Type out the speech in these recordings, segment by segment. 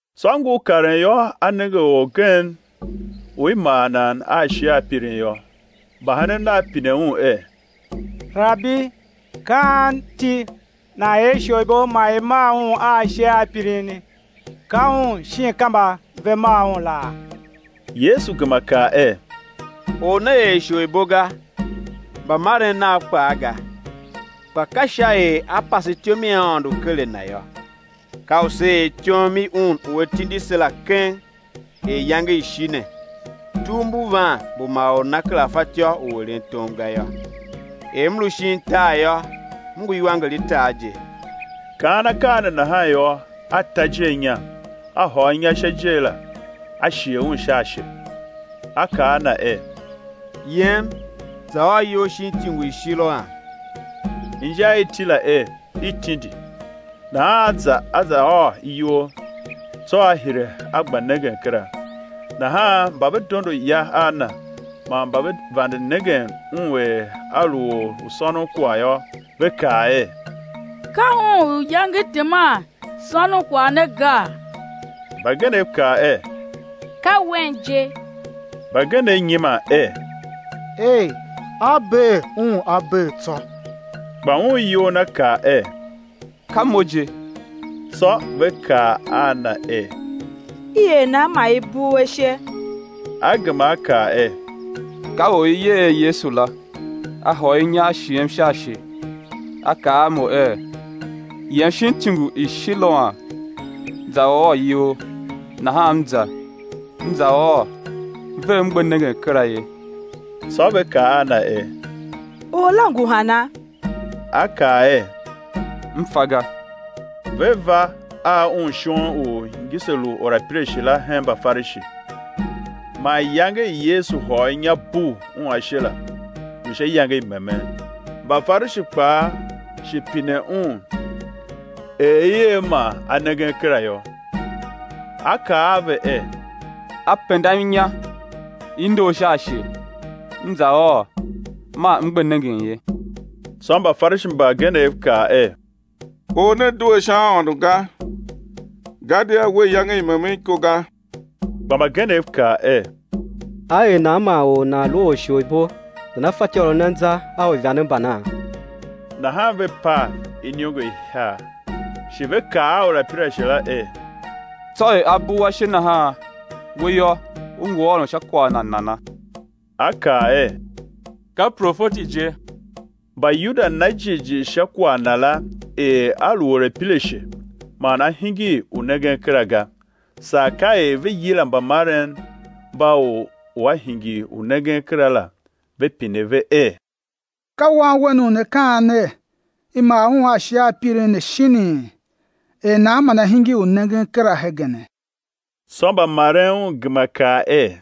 Tsô ngur karen yô, A nenge orgen u i mar nan a ashe a pirin yô. Mbahenen Nav pine Un er: Rabi, ka anti nan er isholibo man i mar un a ashe a pirini, ka un, shin ka mba ve mar un laa? Yesu gema kaa er: Or ne er isholibo ga, mbamaren nav kpaa ga; kpa ka sha er á pase ityom i Aôndo ker a na yô. Ka u sé er ityom i Un u A tindim la keng er iyange i shi ne; tugh mbu van mbu ma or nana kera fatyô u eren tom ga yô. Er M lu shin tar yô, M ngu iwanger i tar je. Kaan akaa ne nahan yô, A ta ijer inya, A hôr inya sha ijer la, A shighe un sha ashe; A kaa a na er: Yem za ôô iyol shin ityungu i Shiloam, (inja i iti la er, i tindi). Nahan a za a za ôô iyol, tsô a hire a gba nengen kera. Nahan mba ve dondo ya a na, man mba ve vande nengen un er a lu or u sônon kwagh yô, ve kaa er: Ka un u iyange teman sônon kwagh ne gaa? Mbagenev kaa er: Ka wen je, mbagenev nyiman er: Ei, a bee un a bee tsô. Kpa un iyol na kaa er: Ka mo je. Tsô ve kaa a na er: I er nan man i bugh u ashe? A gema a kaa er: Ka Or u i yer er Yesu la A hôr inya A shighem sha ashe, A kaa a mo er: Yem shin ityungu i Shiloam, za ôô iyol. Nahan m za, m za ôô ve m gbe nengen kera ye. Tsô ve kaa a na er: Or la ngu hana? A kaa er: M fa ga. Ve va a un shon u ngise lu orapirashe la hen Mbafarishi. Man iyange i Yesu hôr inya bugh un ashe la, lu sha iyange i memen. Mbafarishi kpaa shi pine un er i er man a nengen kera yô. A kaa a ve er: A pendam inya i ndor sha ashe, m za ôô man m gbe nengen ye. Tsô Mbafarishi mbagenev kaa er: Or ne due sha Aôndo ga, gadia we iyange i memen iko ga. Kpa mbagenev kaa er: Á er nan man or u nan lu orisholibo nana fatyô u eren anza a uivande mbana? Nahan ve pav iniongo ihiar. Shi ve kaa a orapirashe la er: Tsô er A bugh u ashe nahan, we yô, u ngu ôron sha kwagh Na nana? A kaa er: Ka profeti je. Mbayuda na jighjigh sha kwagh na la er a lu orapirashe man a hingir u nengen kera ga, saa ka er ve yila mbamaren mba or u a hingir u nengen kera la, ve pine ve er: Ka wan wen u ne kaa ner, i mar un a ashe a pirin ne shinii? Er nan man a hingir u nengen kera hegene? Tsô mbamaren un gema kaa er: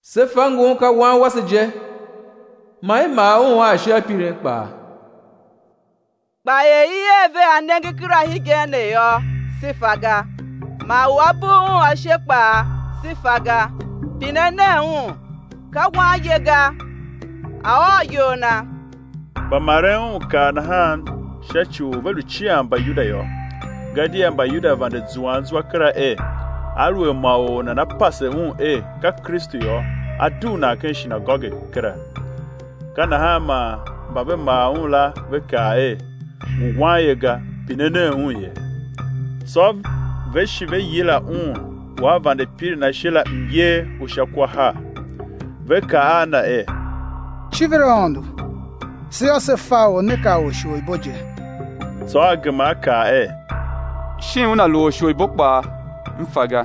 Se fa ngun ka wan wase je, man i mar un a ashe a pirin kpaa; kpa er i er ve a nengen kera hegen ne yô, se fa ga; man u A bugh un ashe kpaa se fa ga; pine nen un, ka wanye ga, a̱ ôr iyol na. Mbamaren un kaa nahan sha ci u ve lu cian Mbayuda yô; gadia Mbayuda vande zuan zwa kera er, aluer ma or nana pase Un er ka Kristu yô, á dugh nan ken shinagoge kera. Ka nahan man mba ve mar un la ve kaa er: Ngu wanye ga, pine nen un, ye. Tsô ve shi ve yila un u a vande pirin ashe la myer u sha kwa har, ve kaa a na er: Civir Aôndo! Se yô, se fa Or ne ka orisholibo je. Tsô a gema a kaa er: Shin Una lu orisholibo kpaa, m fa ga,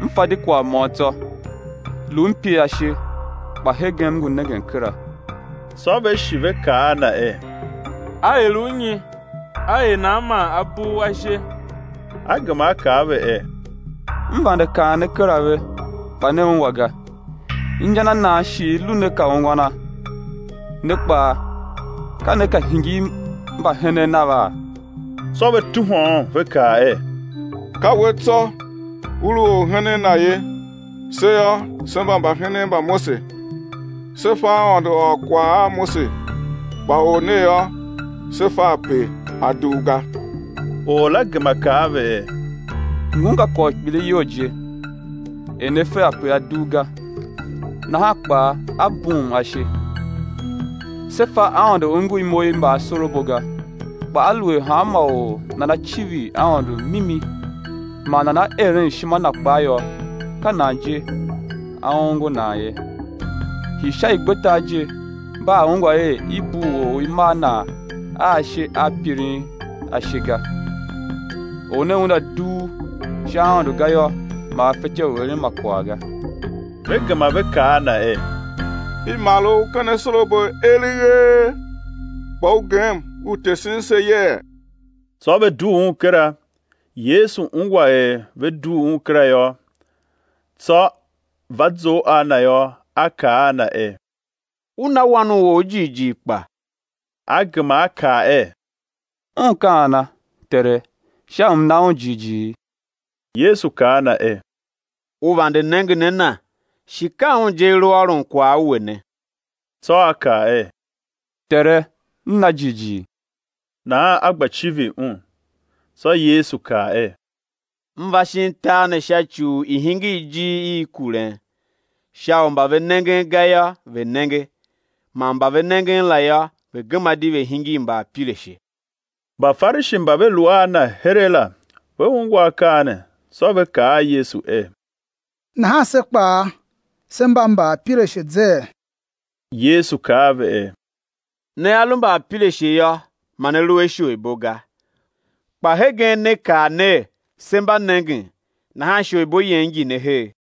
m fa di kwagh môm tsô; lu m pir ashe, kpa hegen m ngu nengen kera. Tsô ve shi ve kaa a na er: A er u nyi? A er nan man A bugh u ashe? A gema a kaa a ve er: M vande kaan ne kera ve, kpa ne ungwa ga; inja na nan shi i lu ne ka ungwana? Ne kpaa, ka ne ka hingir mbahenen Nava? Tsô ve tuhwa un, ve kaa er: Ka we tsô u lu orhenen Na ye; se yô, se mba mbahenen mba Mose. Se fa Aôndo ôr kwagh a Mose kpa Or ne yô, se fa ape A dugh ga. Or la gema kaa a ve er: Ngun ka kwagh u kpiligh iyol je, er ne fe ape A dugh ga, nahan kpaa A bughum ashe. Se fa Aôndo ongo imo i mbaasorabo ga; kpa aluer hanma or nana civir Aôndo mimi man nana eren ishima Na kpaa yô, ka nan je A ongo nan ye. Hii sha igbetar je mba a ungwa er i bugh or u i mar nan a ashe a pirin, ashe ga. Or ne Una dugh sha Aôndo ga yô, ma A fetyô u eren ma kwagh ga. Ve gema ve kaa a Na er: I mar u ken asorabo eleghee, kpa u gem u tesen se yee? Tsô ve dugh un kera. Yesu ungwa er ve dugh un kera yô; tsô va zough a na yô, A kaa a na er: U na Wan u or jighjigh kpa? A gema a kaa er: Un ka ana, Tere, sha u m̱ na Un jighjigh? Yesu kaa a na er: U vande nengen a Na, shi ka Un je A lu ôron kwagh a we ne. Tsô a kaa er: Tere, m na jighjigh! Nahan a gba civir Un. Tsô Yesu kaa er: M va shin tar ne sha ci u i̱ hingir ijir i kuren, sha u mba ve nengen ga yô, ve̱ nenge, man mba ve nengen la yô, ve̱ gema di ve̱ hingir mbaapirashe. Mbafarishi mba ve lu a Na heregh la, ve ungwa akaa ne, tsô ve kaa a Yesu er: Nahan se kpaa se mba mbaapirashe zee? Yesu kaa a ve er: Nea lu mbaapirashe yô, ma ne lu a isholibo ga; kpa hegen ne kaa ner: Se mba nengen; nahan isholibo yen ngi ne her.